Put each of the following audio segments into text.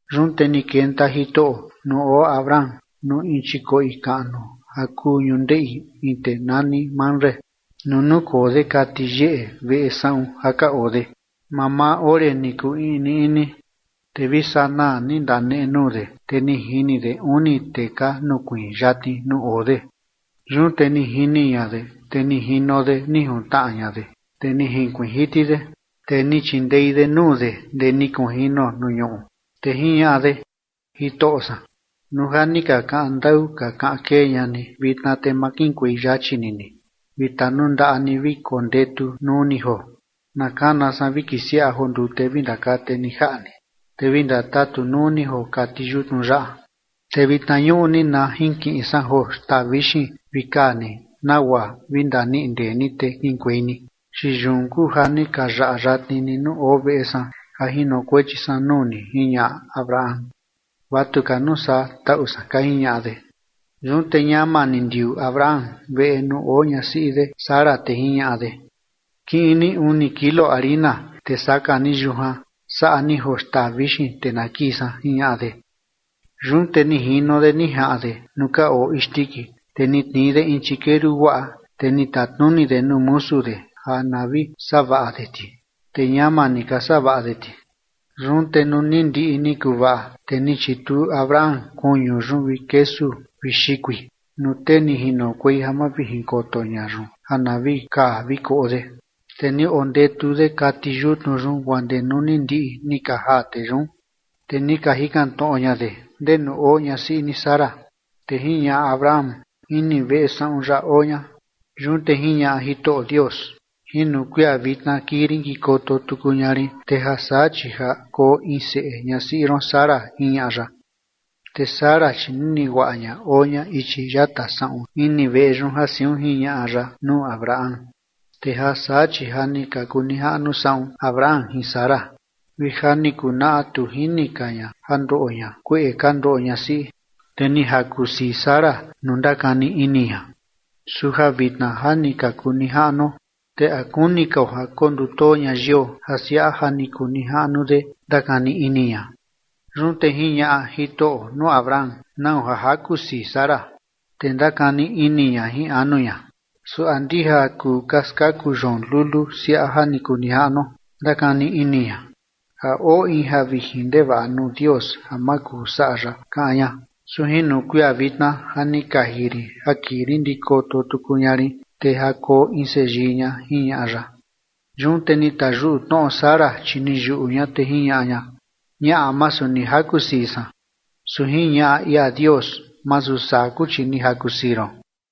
Yun te ni kenta Jitoꞌo nuu oo Abraham nuu in chikoꞌi kaꞌnu ja kuu ñundeꞌi in tee nani Mamre nuu nukoo de kati yeꞌe veꞌe saꞌun ja ka oo de, mamaa ore ni kuu iꞌni iꞌni. Te vi sanaa ni ndanenuu de, te ni jini de uni tee ka nukuiin yatni nuu oo de. Yun te ni jini ña de, te ni jino de ni juntnaꞌa ña de, te ni jinkuiin jiti de, te ni chindei de nuu de ndee ni kunjino nuu ñuꞌu, te jiñaꞌa de: ―Jitoꞌo san, nuu ja ni ka kaꞌan ndaꞌu ka kaꞌan kee ña ni vitna, te ma kiꞌinkuei yachi ni ni vi tanundaꞌa ni vi kondetu nuu ni joo. Na kana san vi kisiaꞌa joo ndute vi ndakate ni jaꞌa ni, te vi ndatatu nuu ni joo kati yutnu yaꞌa. Te vitna ñuꞌni na jinkiꞌin san joo xtaa vixin vi kaa ni nagua vi ndaniꞌi ndee ni, te kiꞌinkuei ni, chi yun kuu ja ni ka yaꞌa yatni ni nuu oo veꞌe san ja jinokuechi san nuu ni ―jiñaꞌa Abraham. ―Vatu ka nuu saa, taꞌu san ―ka jiñaꞌa de. Yun te ñama ni ndiuu Abraham veꞌe nuu oo ñasiꞌi de Sara, te jiñaꞌa de: ―Kiꞌin ni uni kilo harina, te saka ni yujan saꞌa ni joo xtaa vixin, te na kii san ―jiñaꞌa de. Yun te jino de ni jaꞌan de nuu ka oo isndiki, te ni tnii de in chikeru guaꞌa, te ni tatnuni de nuu musu de ja na vi savaꞌa de ti, te ñama ni ka savaꞌa de ti. Yun te nuu ni ndiꞌi ni kuvaꞌa, te ni chituu Abraham kuñu yun vi kesu vi xikui nuu tee ni jinokuei ja mavijinkoto ña yun ja na vi kaa vi koꞌo de, te ni ondetu de kati yutnu yun guaa ndee nuu ni ndiꞌi ni ka jaa tee yun. Te ni ka jikan tnoꞌo ña de: ―¿Ndenu oo ñasiꞌi ni Sara? Te jiñaꞌa Abraham: ―Ini veꞌe saꞌun yaꞌa oo ña. Yun te jiñaꞌa Jitoꞌo Dios: ―Jino kuia vitna kii rin kikoto tuku ña rin, te ja saa chi ja koo in seꞌe ñasiꞌi ron Sara ―jiñaꞌa ya. Te Sara chi nini guaꞌa ña oo ña ichi yata saꞌun ini veꞌe yun ja siun jiñaꞌa ya nuu Abraham. Te ja saa, chi ja ni ka kuu nijaꞌnu saꞌun Abraham jin Sara, vi ja ni kunaꞌa tu jini ka ña ja ndoꞌo ña kueꞌe ka ndoꞌo ñasiꞌi. Te ni jaku sii Sara nuu ndakani ini ña: “Su ja vitna ja ni ka kuu nijaꞌnuo, ¿te a kuni kao ja kondutoo ña yio ja siaꞌa ja ni kuu nijaꞌnu de?”, ndakani ini ña. Yun te jiñaꞌa Jitoꞌo nuu Abraham: ―¿Nau ja jaku sii Sara? Te ndakani ini ña jin anu ña: “¿Su a ndija ja kuu ka skaku yoon lulu siaꞌa ja ni kuu nijaꞌnuo?”, ndakani ini ña. ―¿A oo in ja vijin ndevaꞌa nuu Dios ja ma kuu saꞌa ya, kaꞌan ña? Su jino kuia vitna ja ni kaji rin ja kii rin ndikoto tuku ña rin, te ja koo in seyii ña ―jiñaꞌa ya. Yun te ni tayuꞌu tnoꞌo Sara, chi ni yuꞌu ña, te jiñaꞌa ña: ―Ñaꞌa, masu ni jaku sii san. Su jiñaꞌa ia Dios: ―Masu saa kuu, chi ni jaku sii ron.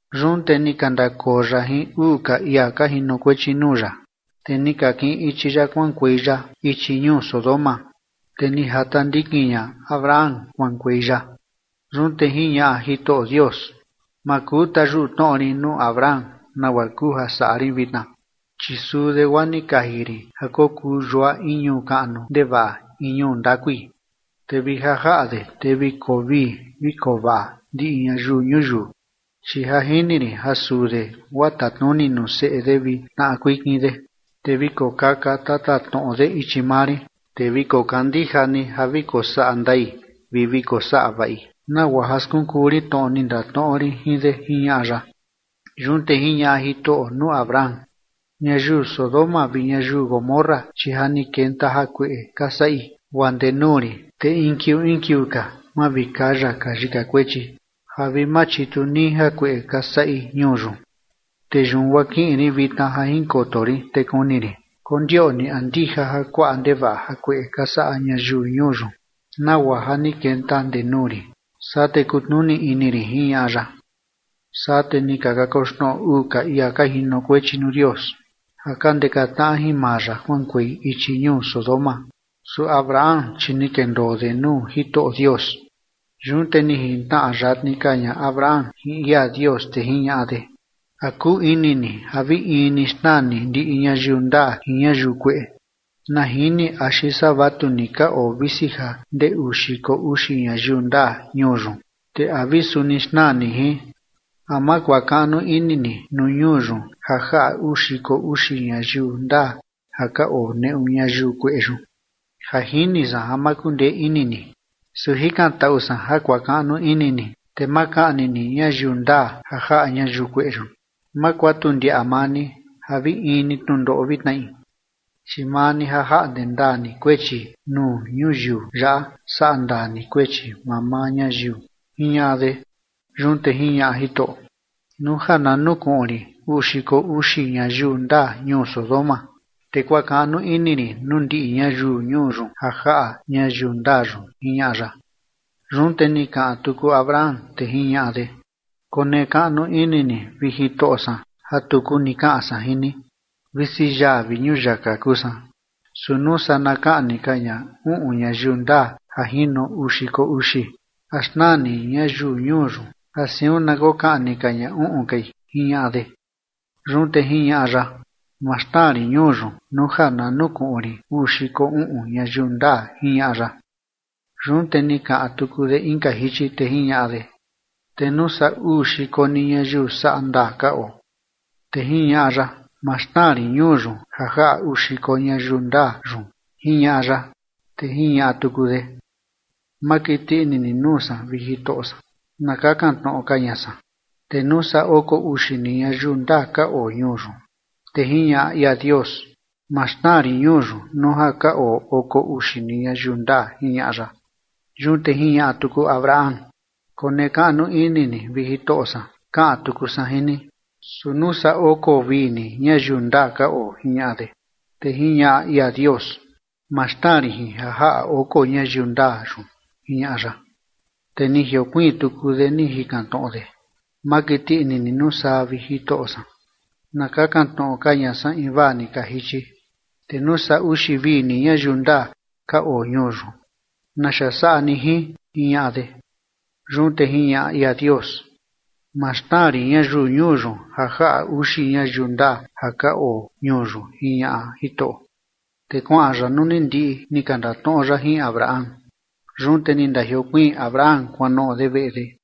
Yun te ni ka ndakoo ya jin uu ka ia ka jinokuechi nuu ya, te ni ka kiꞌin ichi ya kuaꞌankuei ya ichi ñuu Sodoma, te ni jata ndikin ña Abraham kuaꞌankuei ya. Yun te jiñaꞌa Jitoꞌo Dios: “Ma kuu tayuꞌu tnoꞌo rin nuu Abraham nagua kuu ja saꞌa rin vitna, chi suu de guaa ni kaji rin ja kokuu yua in ñuu kaꞌnu ndevaꞌa in ñuu ndakui, te vi ja jaꞌa de, te vi koo vii vi koo vaꞌa ndiꞌi ñayiu ñuyiu, chi ja jini rin ja suu de guaa tatnuni nuu seꞌe de vi tnaꞌa kuikin de, te vi kokaka tatatnoꞌo de ichi maa rin, te vi kokandija ni ja vi kosaꞌa ndai vi vi kosaꞌa vaꞌi nagua ja skunkuu rin tnoꞌo ni ndatnoꞌo rin jin de”, jiñaꞌa ya. Yun te jiñaꞌa Jitoꞌo nuu Abraham: ―Ñayiu Sodoma vi ñayiu Gomorra, chi ja ni kenta jakueꞌe ka saꞌi guaa ndee nuu rin, te in kiuu in kiuu ka mavikaya ka yika kuechi ja vi machitu nii jakueꞌe ka saꞌi ñuu yun. Te yun guaa kiꞌin rin vitna ja jinkoto rin, te kuni rin kondioꞌni a ndija ja kuaꞌa ndevaꞌa jakueꞌe ka saꞌa ñayiu ñuu yun, nagua ja ni kenta ndee nuu rin, saa te kutnuni ini rin ―jiñaꞌa ya. Saa te ni ka kakoxnoꞌo uu ka ia ka jinokuechi nuu Dios ja ka ndeka tnaꞌa jin maa ya kuaꞌankuei ichi ñuu Sodoma. Su Abraham, chi ni kendoo de nuu Jitoꞌo Dios. Yun te ni jintnaꞌa yatni ka ña Abraham jin ia Dios, te jiñaꞌa de: ―¿A kuu ini ni ja vi in ni xnaa ni ndiꞌi ñayiu ndaa jin ñayiu kueꞌe? Na jini axi saa vatu ni ka oo visi ja ndee uu xiko uxi ñayiu ndaa ñuu yun, ¿te a vi suni xnaa ni jin? ¿A ma kuakaꞌnu ini ni nuu ñuu yun ja jaꞌa uu xiko uxi ñayiu ndaa ja ka oo neꞌu ñayiu kueꞌe yun? Ja jini san ja ma kundee ini ni, su jikantaꞌu san ja kuakaꞌnu ini ni, te ma kaꞌni ni ñayiu ndaa ja jaꞌa ñayiu kueꞌe yun. Ma kuatu ndiaꞌa maa ni ja vi in ni tnundoꞌo vi tnaꞌi, chi maa ni ja jaꞌnde ndaa ni kuechi nuu ñuyiu yaꞌa saꞌa ndaa ni kuechi mamaa ñayiu ―jiñaꞌa de. Yun te jiñaꞌa Jitoꞌo: ―Nuu ja na nukuꞌun rin uu xiko uxi ñayiu ndaa ñuu Sodoma, te kuakaꞌnu ini rin nuu ndiꞌi ñayiu ñuu yun ja jaꞌa ñayiu ndaa yun ―jiñaꞌa ya. Yun te ni kaꞌan tuku Abraham, te jiñaꞌa de: ―Konekaꞌnu ini ni, vi Jitoꞌo san, ja tuku ni kaꞌan san jin ni visi yaa vi ñuyaka kuu san. Su nuu saa na kaꞌni ka ña uꞌun ñayiu ndaa ja jino uu xiko uxi, ¿a xnaa ni ñayiu ñuu yun ja siun na kokaꞌni ka ña uꞌun kai? ―jiñaꞌa de. Yun te jiñaꞌa ya: ―Ma xnaa rin ñuu yun nuu ja na nukuꞌun rin uu xiko uꞌun ñayiu ndaa ―jiñaꞌa ya. Yun te ni kaꞌan tuku de inka jichi, te jiñaꞌa de: ―Te nuu saa uu xiko ni ñayiu saꞌa ndaa ka oo. Te jiñaꞌa ya: ―Ma xnaa rin ñuu yun ja jaꞌa uu xiko ñayiu ndaa yun ―jiñaꞌa ya. Te jiñaꞌa tuku de: ―Ma kiti ini ni nuu san, vi Jitoꞌo san, na kakan tnoꞌo ka ña san. Te nuu saa oko uxi ni ñayiu ndaa ka oo ñuu yun. Te jiñaꞌa ia Dios: ―Ma xnaa rin ñuu yun nuu ja ka oo oko uxi ni ñayiu ndaa ―jiñaꞌa ya. Yun te jiñaꞌa tuku Abraham: ―Konekaꞌnu ini ni, vi Jitoꞌo san, kaꞌan tuku san jin ni. Su nuu saa oko vi ni ñayiu ndaa ka oo ―jiñaꞌa de. Te jiñaꞌa ia Dios: ―Ma xnaa rin jin ja jaꞌa oko ñayiu ndaa yun ―jiñaꞌa ya. Te ni jiokuiin tuku de ni jikan tnoꞌo de: ―Ma kiti ini ni nuu san, vi Jitoꞌo san, na kakan tnoꞌo ka ña san invaa ni ka jichi. Te nuu saa uxi vi ni ñayiu ndaa ka oo ñuu yun, ¿naxa saꞌa ni jin? ―jiñaꞌa de. Yun te jiñaꞌa ia Dios: ―Ma xnaa rin ñayiu ñuu yun ja jaꞌa uxi ñayiu ndaa ja ka oo ñuu yun ―jiñaꞌa Jitoꞌo. Te kuaꞌan ya nuu ni ndiꞌi ni ka ndatnoꞌo ya jin Abraham. Yun te ni ndajiokuiin Abraham kuanoꞌo de veꞌe de.